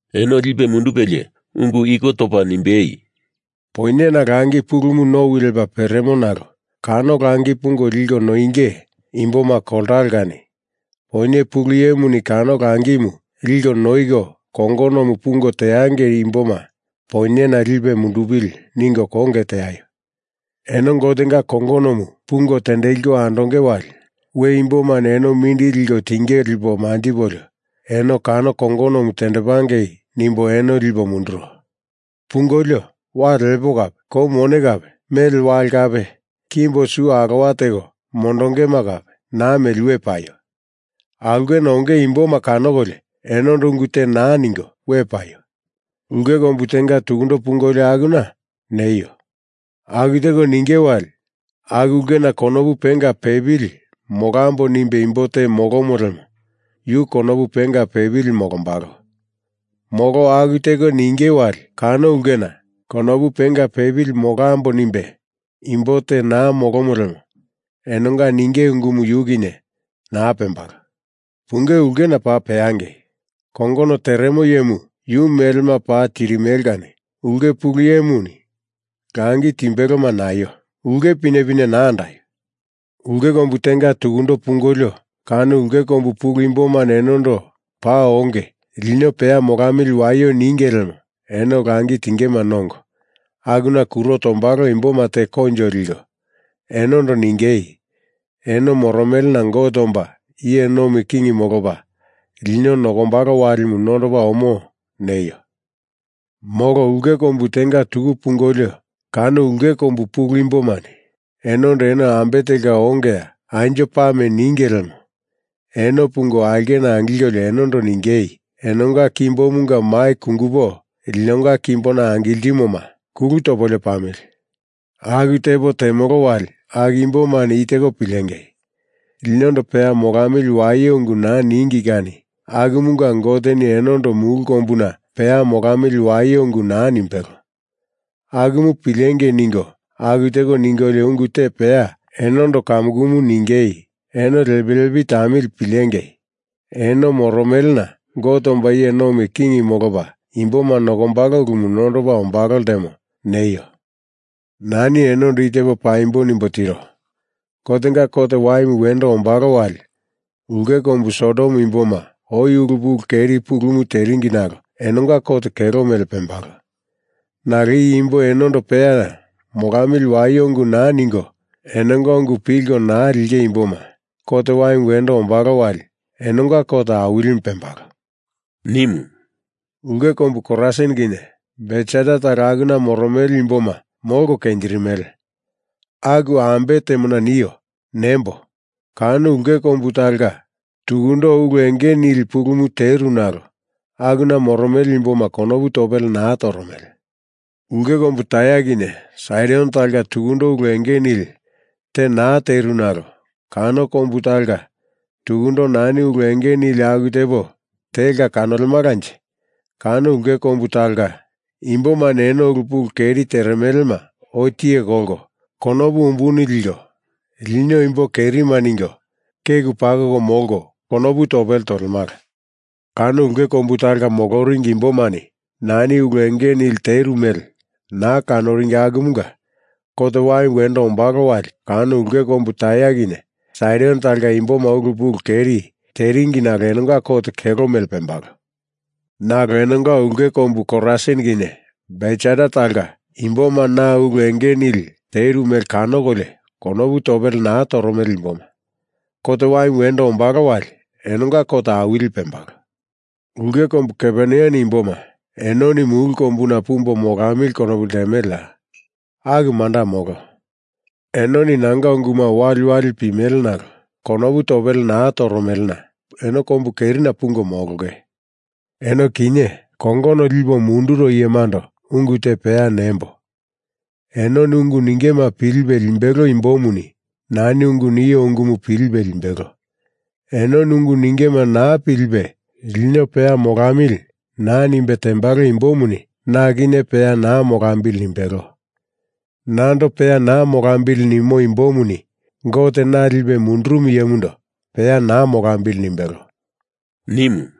Eno lipe mundupelie ungu iko topa nimbei, “Poinyena langi pulumu nowi lepa peremo nalo kano langi pungo liko noinge imboma koltalo kani Poinye Pulu Iyemuni kano langimu liko noiko kongonomu pungo teangei imboma poinyena lipe mundupili ningo konge teaio! Eno Gotenga kongonomu pungo tendeliko andonge wali we imbomani eno mindili liko tinge lipo manjipolio eno kano kongonomu tendepangei nimbo eno lipo munduro. Pungolio, wale lepo kape, kou mone kape, mele wale kape, kimbo su alowa teko mondongema kape naa meli we paio! Aulkena onge imboma kanokolio enondo ungu te naa ningo we paio! Ulke kombu tenga tukundo pungolio akuna,” neio! Aku teko ninge wali aku ulkena konopu penga pepili molambo nimbe imbo te molomo lemo yu konopu penga pepili molombalo. Molo aku teko ninge wali kano ulkena. konopu penga pepili molambo nimbe imbo te naa molomo lemo enonga ninge ungumu yu kinye naa pembalo. Punge ulkena paa peangei! Kongono teremo iyemu yu melema paa tirimele kani ulke pulu iyemuni langi timbeloma naio! Ulke pinepine naa andaio! Ulke kombu tenga tuku pungolio, kano ulke kombu pulu imbomani enondo, paa onge, lino peya molamili waio ninge lemo eno langi tingema nongo, akuna kuro tombalo imboma teko koinjo liko, enondo ningei, “Eno moromelena Gote omba iye nomi king molopa lino nokombalo walimu nondopa omo,” neio! Molo ulke kombu tenga tuku pungolio kano ulke kombu pulu imbomani enondo eno ambe telka ongeya, anjo pame ninge lemo eno pungo aulkena angilkolio enondo ningei, “Enonga kombumunga mai kungupo, linonga kimbona angiltimoma kulu topolio pamili! Aku tepo temolo wali aku imbomani i teko pilengei: Linondo peya molamili waio ungu naa ningi kani akumunga Goteni enondo mulu kombuna peya molamili waio ungu naa nimbelo. Akumu pilengei ningo aku teko ningolio ungu te peya enondo kamukumu ningei, ‘Eno lepi lepi tamili pilengei! Eno moromelena Gote omba iye nomi king molopa imboma nokombalo ulumu nondopa omba ltemo,’ neio! Nani enondo i tepo paimbo nimbo tiro, Gotenga kot waimu wendo ombalo wali ulke kombu Sodom imboma oi ulu pulu keri pulumu teringi nalo enonga kot kelo mele pembalo. Nalo i imbo enondo peya molamili waio ungu naa ningo, enonga ungu pilko naa linge imboma, kot waimu wendo ombalo wali enonga kot awilimu pembalo,” nimu. “Ulke kombu Korasin kinye Betsaida talo akuna moromele imboma molko kenjirimele! Aku ambe temona nio? Nembo! Kano ulke kombu talonga tukundo ulu enge nili pulumu teru nalo akuna moromele imboma konopu topele naa toromele. Ulke kombu Tair kinye Saidon talonga tukundo ulu enge nili te naa teru nalo kano kombu talonga tukundo nani ulu enge nili aku tepo telka kanolemalanje, kano ulke kombu talonga imbomani eno ulu pulu keri teremelema oi tiye kolko, konopu umbulu liko lino imbo kerima ningo keku tapuwe tiko molko, konopu topele tolemala. Kano ulke kombu talonga moloringi imbomani nani ulu enge nili teru mele naa kanoringi akumunga kot waimu wendo ombalo wali kano ulke kombu Tair kinye Saidon talonga imboma ulu pulu keri teringi nalo enonga kot kelo mele pembalo. Nalo eno ulke kombu Korasin kinye Betsaida talonga imboma na ulu enge nili teru mele kanokolio konopu topele naa toromele imboma, kot waimu wendo ombalo wali enonga kot awili pembalo. Ulke kombu Kaperneam imboma enoni mulu kombuna pumbo molamili konopu ltemeleya? Aku manda molo. Enoni nanga unguma waliwali pimele nalo konopu topele naa toromelena eno kombu kerina pungo molonge. Eno kinye kongono lipo munduro iyemando ungu te peya nembo! Enoni ungu ningema pilipe limbelo imbomuni nani ungu nio ungumu pilipe limbelo. Enoni ungu ningema naa pilipe, lino peya molamili naa nimbe tembalo imbomuni na kinye peya naa molambili nimbelo. Nando peya naa molambili nimo imbomuni Gote, na lipe mundurumu iyemundo peya naa molambili nimbelo,” nimu.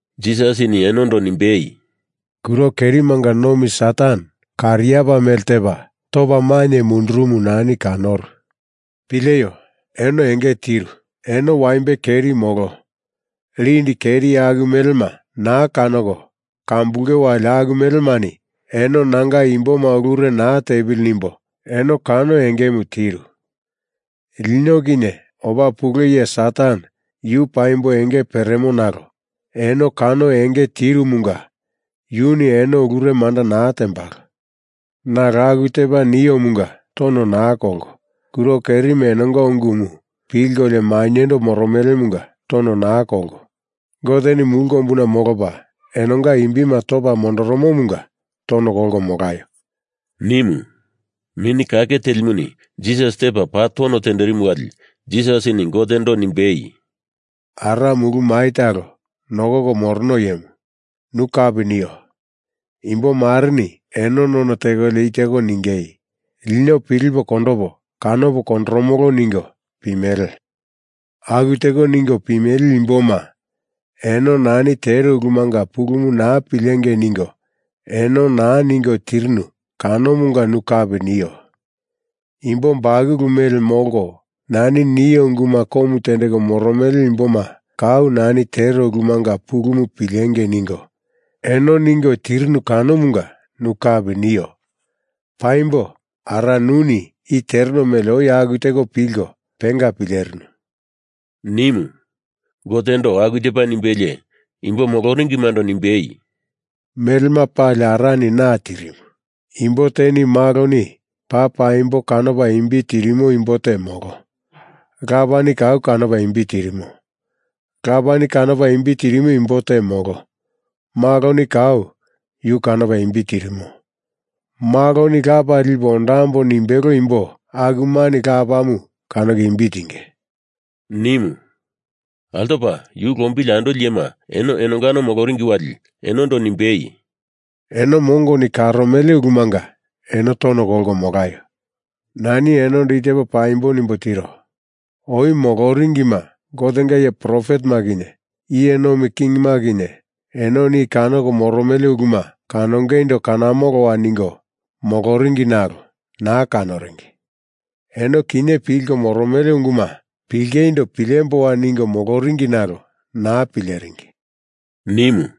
Jisasini enondo nimbei, “Kuro kerimanga nomi Satan kariapa mele tepa, topa mainye mundurumu nani kanoru. Pileio! Eno enge tiru. Eno waimbe keri molo lindi keri aku melema naa kanoko kambulunge wali aku melemani eno nanga imboma ulure naa tepili nimbo eno kano engemu tiru. Lino kinye opa pule iye Satan yu paimbo enge peremo nalo eno kano enge tirumunga yuni eno ulure manda naa tembalo. Nalo aku tepa niomunga tono naa kolko, kuro kerima enonga ungumu pilkolio maindo moromelemunga tono naa kolko; Goteni mulu kombuna molopa enonga imbima topa mondorumumunga tono kolko molaio!” nimu. Mini Kake Telimuni Jisas tepa paa tono tenderimu wali Jisasini Gotendo nimbei, “Ara, mulu mai talo nokoko morono iyemu, nu kapi nio. Imbo mareni eno none tekolio i teko ningei, lino pilipo kondopo, kanopo kondoromolo ningo pimele. Aku teko ningo pimele imboma eno nani tero ulumanga pulumu naa pilengei ningo eno naa ningo tirinu kanomunga nu kapi nio. Imbo bakulu mele molko, nani nio unguma komu tendeko moromele imboma kau nani tero ulumanga pulumu pilengei ningo, eno ningo tirinu kanomunga nu kapi nio. Paimbo Ara, nuni i tereno mele oi aku teko pilko penga pilerinu,” nimu. Gotendo aku tepa nimbelie imbo moloringimando nimbei, “Melema pali Arani na tirimu. Imbo teni Maloni paa paimbo kanopa imbi tirimo imbo te molo, Lapani kau kanopa imbi tirimo. Lapa kanopa imbi tirimo imbo te molo. Maloni kau yu kanopa imbi tirimo, Maloni Lapa lipo ondambo nimbelo imbo akumani Lapamu kanoko imbi tinge,” nimu. Altopa yu lombili andoli iyema eno enonga moloringi wali enondo nimbei, “Eno mongoni karomele ulumanga eno tono kolko molaio! Nani enondo i tepo paimbo nimbo tiro. Oi moloringima, Gotenga iye profetema kinye, iye nomi kingima kinye, enoni i kanoko moromele uluma kanongeindo kanamoloa ningo moloringi nalo naa kanoringi. Eno kinye pilko moromele unguma pilingeindo pilemboa ningo moloringi nalo naa pileringi,” nimu.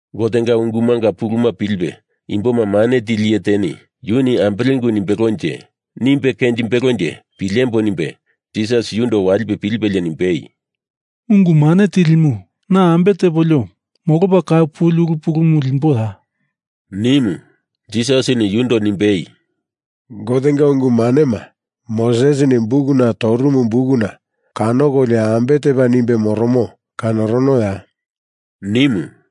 Gotenga ungumanga pulumu pilipe imboma mane tili iye teni yuni ambele ungu nimbelonje, nimbe kenjimbelonje pilembo nimbe Jisasindo walipe pilipelie nimbei, “Ungu Mane Tilimu, na ambe tepolio molopa kau puli ulu pulumu limboya?” nimu. Jisasini yundo nimbei, “Gotenga ungu manema Mosesini bukuna torumu bukuna kanokolio ambe tepa nimbe moromo, kanoronoya?” nimu.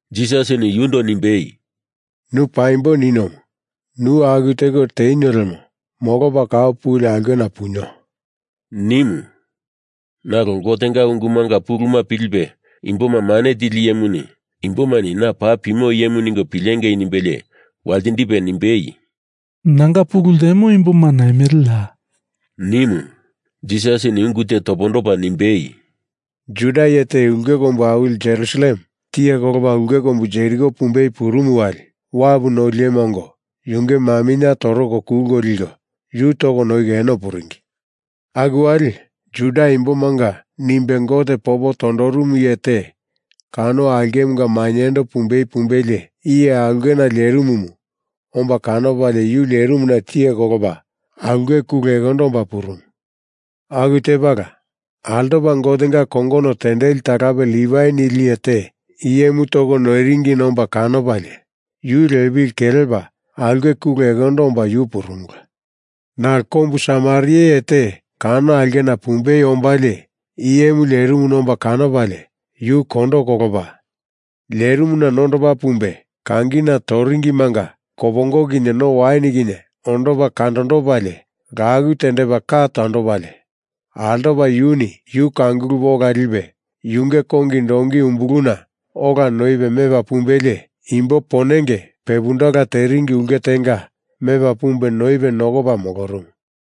Jisasini yundo nimbei, “Nu paimbo ninomu. Nu aku teko tenio lemo molopa kau puli aulkena punio,” nimu. Nalo Gotenga ungumanga pulumu pilipe imboma mane tili iyemuni imbomani na paa pimo iyemu ningo pilengei nimbelie waltindipe nimbei, “Nanga pulu ltemo imboma naimele ya?” nimu. Jisasini ungu te topondopa nimbei, “Jura iye te ulke kombu awili Jerusalem tiye kolopa ulke kombu Jeriko pumbei purumu wali wapu noli iyema ongo yunge maminye toroko kulko liko yu toko noiko eno puringi. Aku wali Juda imbomanga nimbe Gote popo tondorumu iye te kano aulkemunga mainyendo pumbei pumbelie, iye aulkena lerimumu omba kanopalie yu lerimuna tiye kolopa aulke kule ekondondo omba purumu. Aku tepala altopa Gotenga kongono tendeli talape Livai nili iye te iyemu toko noiringina omba kanopalie yu lepili kelepa aulke kule ekondondo omba yu purumula. Nalo kombu Samaria iye te kano aulkena pumbei ombalie iyemu lerimuna omba kanopalie yu kondo kolopa, lerimuna nondopa pumbe kangina toringimanga kopongo kinye no wain kinye ondopa kandondopalie laku tendepa ka tondopalie, altopa yuni yu kangulupe ola lipe yunge kongi donki umbuluna ola noipe mepa pumbelie imbo ponenge pepundala teringi ulke tenga mepa pumbe noipe nokopa molorumu.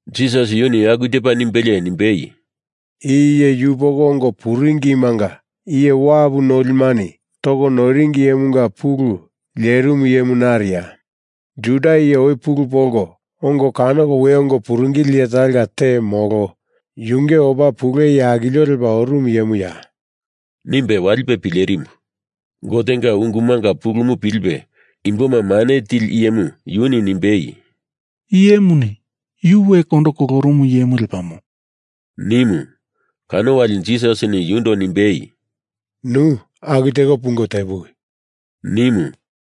Jisas yuni aku tepa nimbelie nimbei, “I iye yupoko ongo puringimanga iye wapu nolimani toko noiringi iyemunga pulu lerimu iyemu nariya? Juda iye oi pulu polko ongo kanoko we ongo puringili iye talonga te molo yunge opa pule iye akilio lepa orumu iyemuya?” nimbe walipe pilerimu. Gotenga ungumanga pulumu pilipe imboma mane tili iyemu yuni nimbei, “Iyemuni yu we kondo kolorumu iyemu lepamo,” nimu. Kano wali Jisasini yundo nimbei, “Nu aku teko pungo tepuwi!” nimu.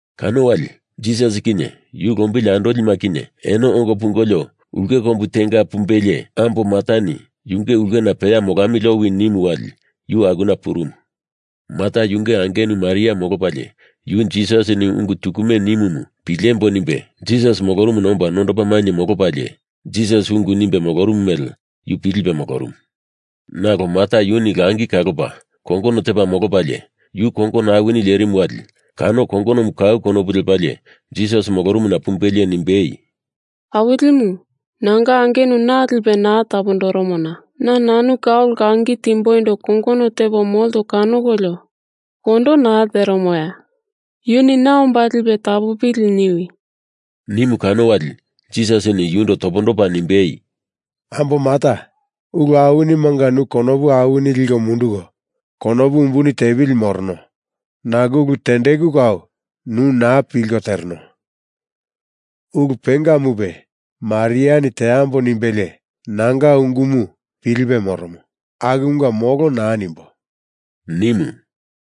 Kano wali Jisas kinye yu lombili andolima kinye eno ongo pungolio ulke kombu tenga pumbelie ambo Martani yunge ulkena peya molamili owi nimu wali yu akuna purumu. Marta yunge angenu Maria molopalie yu Jisasini ungu tukume nimomu pilembo nimbe Jisas molorumuna omba nondopa mainye molopalie, Jisas ungu nimbe molorumu mele yu pilipe molorumu. Nalo Marta yunu langi kalopa, kongono tepa molopalie yu kongono awini lerimu wali kano kongonomu kau konopu lepalie Jisas molorumuna pumbelie nimbei, “Awilimu, nanga angenu na lipe naa tapondoromona na nanu kau langi timboindo kongono tepo molto kanokolio kondo naa teremoya? Yuni na omba lipe tapopili niwi!” nimu kano wali Jisasini yundo topondopa nimbei, “Ambo Marta, ulu awinimanga nu konopu awini liko munduko konopu umbuni tepili morono nalo ulu tendeku kau nu naa pilko tereno. Ulu pengamupe Mariani teambo nimbelie nanga ungumu pilipe moromo. Akumunga molo naa nimbo,” nimu.